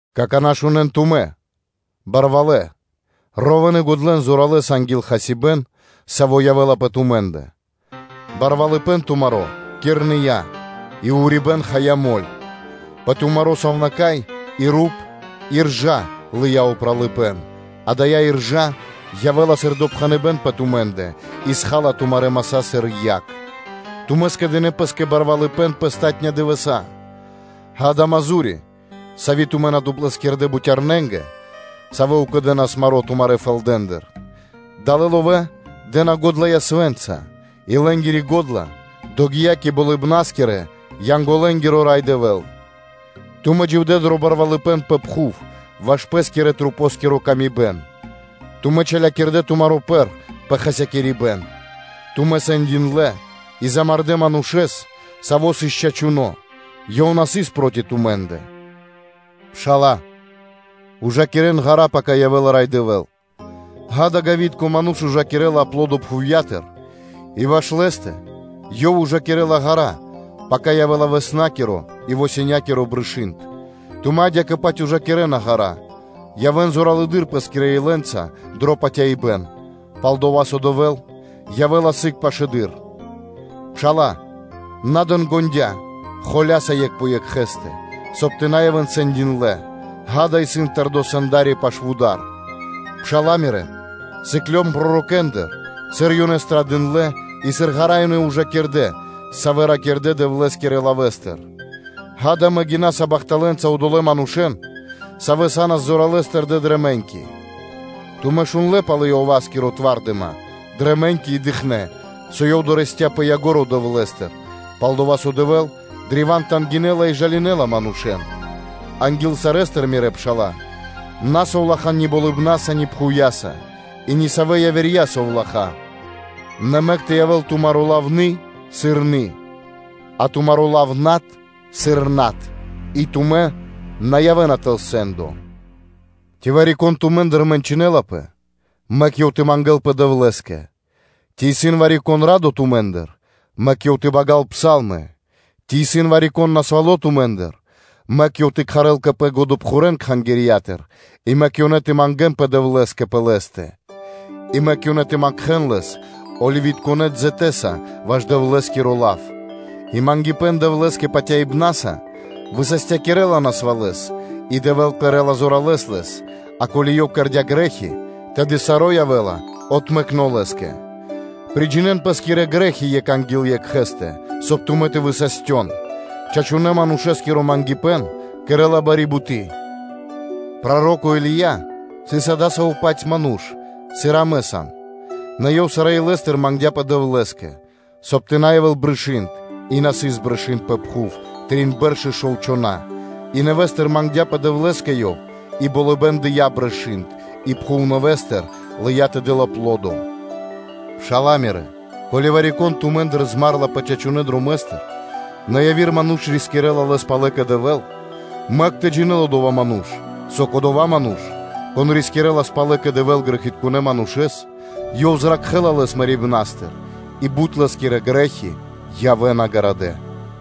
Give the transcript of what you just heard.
Какана́ шунэ́н тумэ́, барвалэ́ мануша́лэ, ровэ́н и годлэн зоралэ́с анги́л хасибэ́н, саво́ явэ́ла пэ тумэ́ндэ. Барвалыпэ́н тумаро́ кирныя, и урибэ́н хая мэль (моль) Пэ тумаро́ сувнака́й и руп иржа лыя́ упралыпэ́н, дая́ иржа явэ́ла сыр допхэныбэ́н пэ тумэ́ндэ, и схала тумарэ́ маса́ сыр яг. Тумэ́ скэдынэ́ пэ́скэ кучипэ́н пэ палатунэ́ дывэса́. Ѓа́да, исын мазу́ри (награда), сави́ тумэ́ на доплэскирдэ бутярнэнгэ, савэ́ укэдэнас маро́ тумарэ́ фэлдатыр, далэ́ ловэ́ дэ́на ґодла ясвэ́нца и лэ́нгири го́дла догия́ кэ болыбна́скирэ-янголэ́нгиро Рай Дэвэ́л. Тумэ́ дживдэ́ дро барвалыпэ́н пэ пхув ваш пэ́скирэ-масэ́нгиро камибэн; тумэ́ чалякирдэ тумаро́ пэр пэ хасякирибэн; тумэ́ сэндиндлэ и мулякирдэ манушэ́н, савоэ сыс чачуноэ; ёнэ на сыс проти тумэ́ндэ. Пшала́лэ, вырикирэн ґара́ (длу́гэс), пака явэ́ла Рай Дэвэ́л. Ѓа́да, ґавитко ману́ш ужакирэ́ла аплодо пхувья́тыр и ваш лэскэ ёв ужакирэ́ла ґара́ (длу́гэс), пака явэ́ла тасярлуно (раннё) и коригуно (позднё) брышы́нд. Тумэ́ адя́кэ-паць вырикирэн ґара́ (длу́гэс): явэ́н зоралэды́р пэ́скирэ илэнца дро патяибэ́н, пал-дова́ со Дэвэ́л явэ́ла сыг пашылэды́р. Пшала́лэ, на дэн ґондя́ (на уздыхинэн) холя́са екх пэ екхэ́стэ, соб (кай) тумэ́ тэ на явэ́н сэндиндлэ. Ѓа́да, исын тэрдо́ Сэнда́ри пашы́л вуда́р. Пшала́лэ мирэ́, сыклён пророкэндыр, сыр ёнэ страдындлэ и сыр ґара́ ёнэ ужакирдэ, савэ́ ракирдэ́ Дэвлэ́скирэ лавэ́стыр. Ѓа́да, амэ гинаса бахталэнца одолэ́ манушэ́н, савэ́ сыс зоралэ́с тэрдэ́ дрэ мэ́ньки. Тумэ́ шундлэ́ пал Иоваскири тва́рдыма дрэ мэ́ньки и дыкхнэ́, со ёв дорэсця́ дро ко́нцо (дро яго́ро) Дэвлэ́стыр, пал-дова́ со Дэвэ́л древа́н тангинэла и жалинэла манушэ́н. Анги́л сарэ́стыр, мирэ́ пшала́лэ, на совлахан ни болыбнаса, ни пхувья́са, и нисавэ явирэ совлахаса; нэ мэк тэ явэ́л тумаро́ лав “ны, аи”, сыр “ны, аи”, а тумаро́ лав “над” сыр “над”, и тумэ́ на явэ́на тэл сэ́ндо. Ци вари-кон тумэ́ндыр мэнчынэлапэ? Мэк ёв тэ мангэ́лпэ Дэвлэ́скэ. Ци исын вари-кон радо тумэ́ндыр? Мэк ёв тэ багал псалмы. Ци исын вари-кон насвало́ тумэ́ндыр? Мэк ёв тэ кхарэл кэ пэ годэпхурэн Кхангирья́тыр, и мэк ёнэ тэ мангэ́нпэ Дэвлэ́скэ пэ лэ́стэ, и мэк ёнэ тэ макхэн лэс оливитконэ дзэтэса ваш Дэвлэ́скиро лав; и мангипэ́н Дэвлэ́скэ патяибна́са высастякирэла насвалэс и Дэвэ́л кэрэ́ла зоралэса лэс; а ко́ли ёв кэрдя́ грэ́хи, тэды саро́ явэ́ла отмэкно лэ́скэ. Приджинэн пэ́скирэ грэ́хи екх анги́л екхэ́стэ, соб (кай) тумэ́ тэ высастён: чачунэ́ манушэ́скиро мангипэ́н кэрэ́ла бари буты́. Проро́ко Или́я сыс адасаво́-паць ману́ш, сыр и амэ сам, нэ ёв сарэ́ илэ́стыр мангдя́пэ Дэвлэ́скэ, соб (кай) тэ на явэ́л брышы́нд; и на сыс брышы́нд пэ пхув трин бэрш и шов чхона́, и нэвэ́стыр мангдя́пэ Дэвлэ́скэ ёв, и болыбэ́н дыя́ брышы́нд, и пхув нэвэ́стыр лыя́ тэ дэл аплодо. Пшала́лэ мирэ́, ко́ли вари-кон тумэ́ндыр змарэлапэ чачунэ́ дромэ́стыр, нэ яви́р ману́ш рискирэ́ла лэс палэ кэ Дэвэ́л, мэк тэ джинэ́л одова́ ману́ш, со кодова́ ману́ш, кон рискирэлас палэ кэ Дэвэ́л грэхитконэ́ манушэ́с, ёв зракхэ́ла лэс мэрибна́стыр, и бут лэ́скирэ грэ́хи явэ́на гарадэ́.